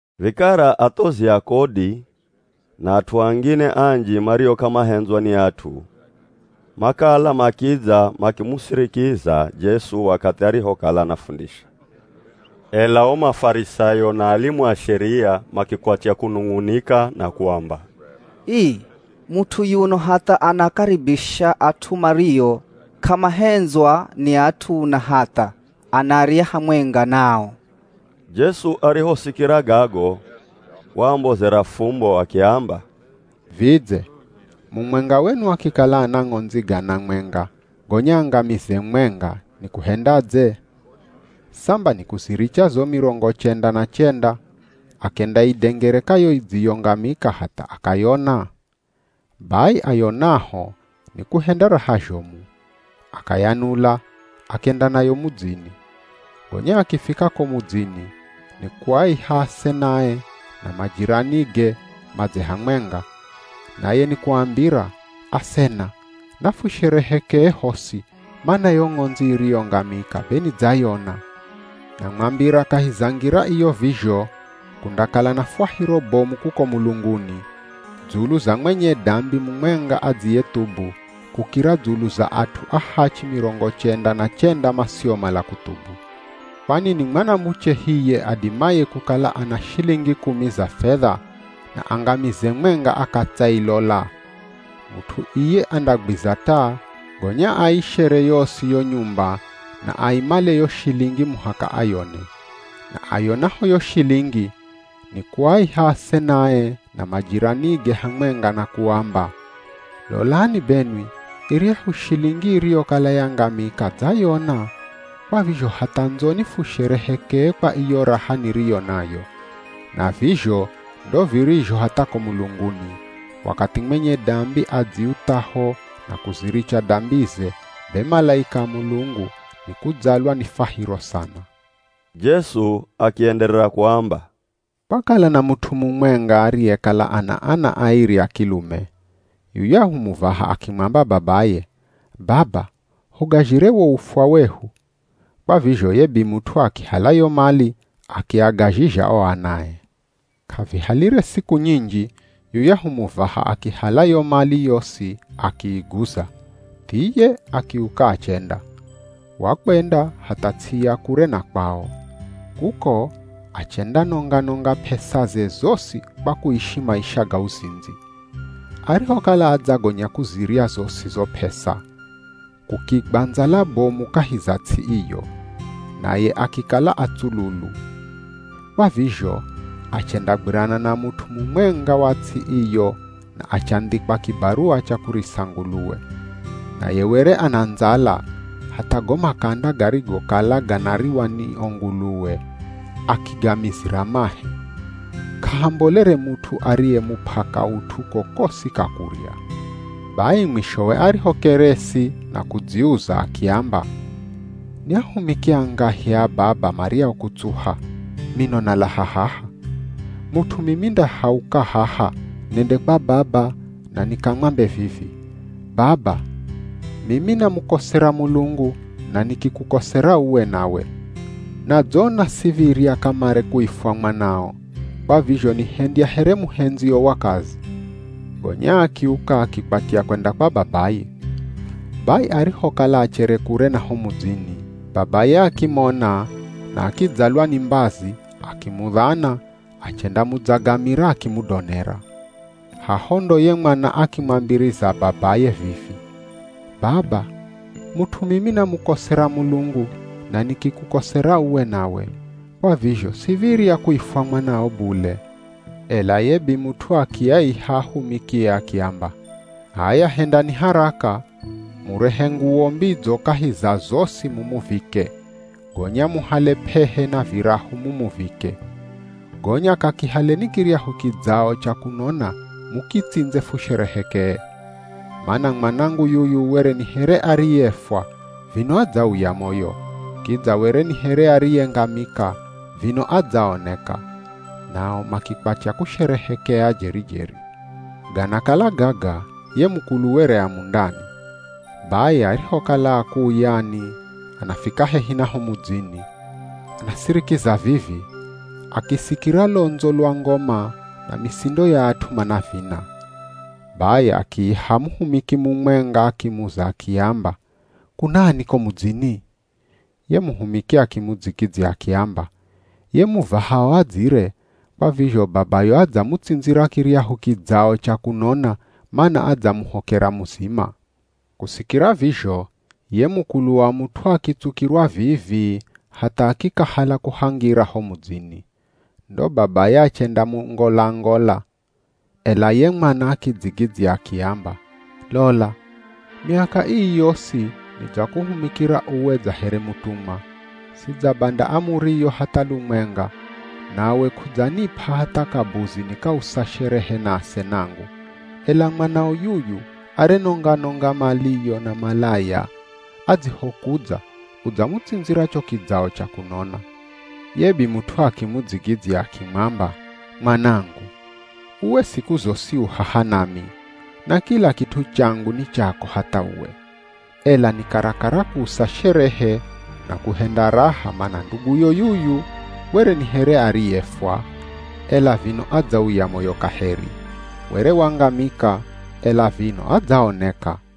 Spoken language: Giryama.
Vikara athozi a kodi na at'u angine anji mario k'amahendzwa ni at'u makala makidza makimusirikiza Jesu wakathi arihokala anafundisha. Ela o Mafarisayo na alimu a Sheria makikwatya kunung'unika na kuamba, “Ii, mut'u yuno hatha anakaribisha at'u mario k'amahendzwa ni at'u na hatha anarya hamwenga nao!” Jesu arihosikira gago waambozera fumbo akiamba, “Vidze mumwenga wenu akikala ana ng'ondzi gana mwenga gonya angamize mwenga, nikuhendadze? Samba nikuziricha zo mirongo chenda na chenda, akendaidengereka yo idziyongamika hatha akayona. Bai ayonaho nikuhenda raha zhomu, akayanula, akenda nayo mudzini. Gonya akifika ko mudzini ni kuaiha asenae na majiranige madze hamwenga, naye ni kuambira, ‘Asena, nafusherehekee hosi mana yo ng'ondzi iriyongamika be nidzayona.’ Namwambira kahi za ngira iyo vizho, kundakala na fwahiro bomu kuko mulunguni, dzulu za mwenye dambi mumwenga adziyethubu, kukira dzulu za at'u ahachi mirongo chenda na chenda masiomala kuthubu. “Kwani ni mwanamuche hiye adimaye kukala ana shilingi kumi za fedha na angamize mwenga akatsailola? Mut'u iye andagwiza taa, gonya aishere yosi yo nyumba na aimale yo shilingi muhaka ayone. Na ayonaho yo shilingi, ni kuaiha asenae na majiranige hamwenga na kuamba, ‘Lolani benwi iryahu shilingi iriyokala yangamika dzayona. Kwa vizho hatha ndzoni fusherehekee kwa iyo raha niriyo nayo.’ Na vizho ndo virizho hatha ko mulunguni, wakathi mwenye dambi adziuthaho na kuziricha dambize, be malaika a Mulungu ni kudzalwa ni fwahiro sana.” Jesu akienderera kuamba, “Kwakala na mut'u mumwenga ariyekala na ana airi a kilume. Yuyahu muvaha akimwamba babaye, ‘Baba hugazhire wo ufwa wehu.’ Kwa vizho ye bimut'u akihala yo mali akiagazhizha o anae. K'avihalire siku nyinji yuyahu muvaha akihala yo mali yosi akiiguza. Thiye akiuka achenda. Wakwenda hatha ts'i ya kure na kwao, kuko achendanonga-nonga p'esaze zosi kwa kuishi maisha ga uzindzi.” “Arihokala adzagonya kuzirya zosi zo p'esa, kukigwa ndzala bomu kahi za ts'i iyo. Naye akikala atsululu. Kwa vizho achendagwirana na mut'u mumwenga wa ts'i iyo na achandhikwa kibaruwa cha kurisa nguluwe. Naye were ana ndzala, hatha go makanda garigokala ganariwa ni o nguluwe akigamizira mahe. K'ahambolere mut'u ariyemup'a kaut'u kokosi ka kurya. “Bai mwishowe arihokeresi na kudziuza akiamba, ‘Ni ahumiki angahi a baba maryao kutsuha, mino nalaha haha! Mut'u mimi ndahauka haha nende kwa baba na nikamwambe vivi, “Baba, mimi namukosera Mulungu na nikikukosera uwe nawe. Nadzona siv̱irya kamare kuifwa mwanao, kwa vizho nihendya here muhendzio wa kazi.” ’ “Gonya akiuka akikwatya kwenda kwa babaye. Bai arihokala achere kure na ho mudzini, babaye akimona na akidzalwa ni mbazi, akimudhana achendamudzagamira akimudonera. Haho ndo ye mwana akimwambiriza babaye vivi, ‘Baba, mut'u mimi namukosera Mulungu na nikikukosera uwe nawe, kwa vizho siv̱irya kuifwa mwanao bule.’ Ela ye bimut'u akiaiha ahumikie akiamba, ‘H'aya hendani haraka, murehe nguwo mbidzo kahi za zosi mumuvike, gonya muhale p'ehe na virahu mumuvike. Gonya kakihaleni kiryahu kidzao cha kunona mukitsindze fusherehekee. Mana mwanangu yuyu were ni here ariyefwa vino adzauya moyo, kidza were ni here ariyengamika, vino adzaoneka.’ Nao makikwatya kusherehekea jeri-jeri. “Ganakala gaga ye mukulu were a mundani, bai arihokala akuuyani anafika hehi na ho mudzini, anasirikiza vivi, akisikira londzo lwa ngoma na misindo ya at'u manavina. Bai akiiha muhumiki mumwenga akimuza akiamba, ‘Kunani ko mudzini?’ Ye muhumiki akimudzigidzya akiamba, ‘Ye muvahao adzire, kwa vizho babayo adzamutsindzira kiryahu kidzao cha kunona mana adzamuhokera muzima.’ Kusikira vizho ye mukulu wa mut'u akitsukirwa vii-vii hatha akikahala kuhangira ho mudzini. Ndo babaye achendamungolangola, ela ye mwana akidzigidzya akiamba, ‘Lola, miaka ii yosi nidzakuhumikira uwe dza here mutumwa, sidzabanda amuriyo hatha lumwenga, nawe k'udzanip'a hatha kabuzi nikausa sherehe na asenangu. Ela mwanao yuyu, arenonga-nonga maliyo na malaya adzihokudza udzamutsindzira cho kidzao cha kunona.’ Ye bimut'u akimudzigidzya akimwamba, ‘Mwanangu, uwe siku zosi u haha nami, na kila kit'u changu ni chako hatha uwe. Ela ni karakara kuusa sherehe na kuhenda raha mana nduguyo yuyu were ni here ariyefwa, ela vino adzauya moyo kaheri, were wangamika, ela vino adzaoneka.’”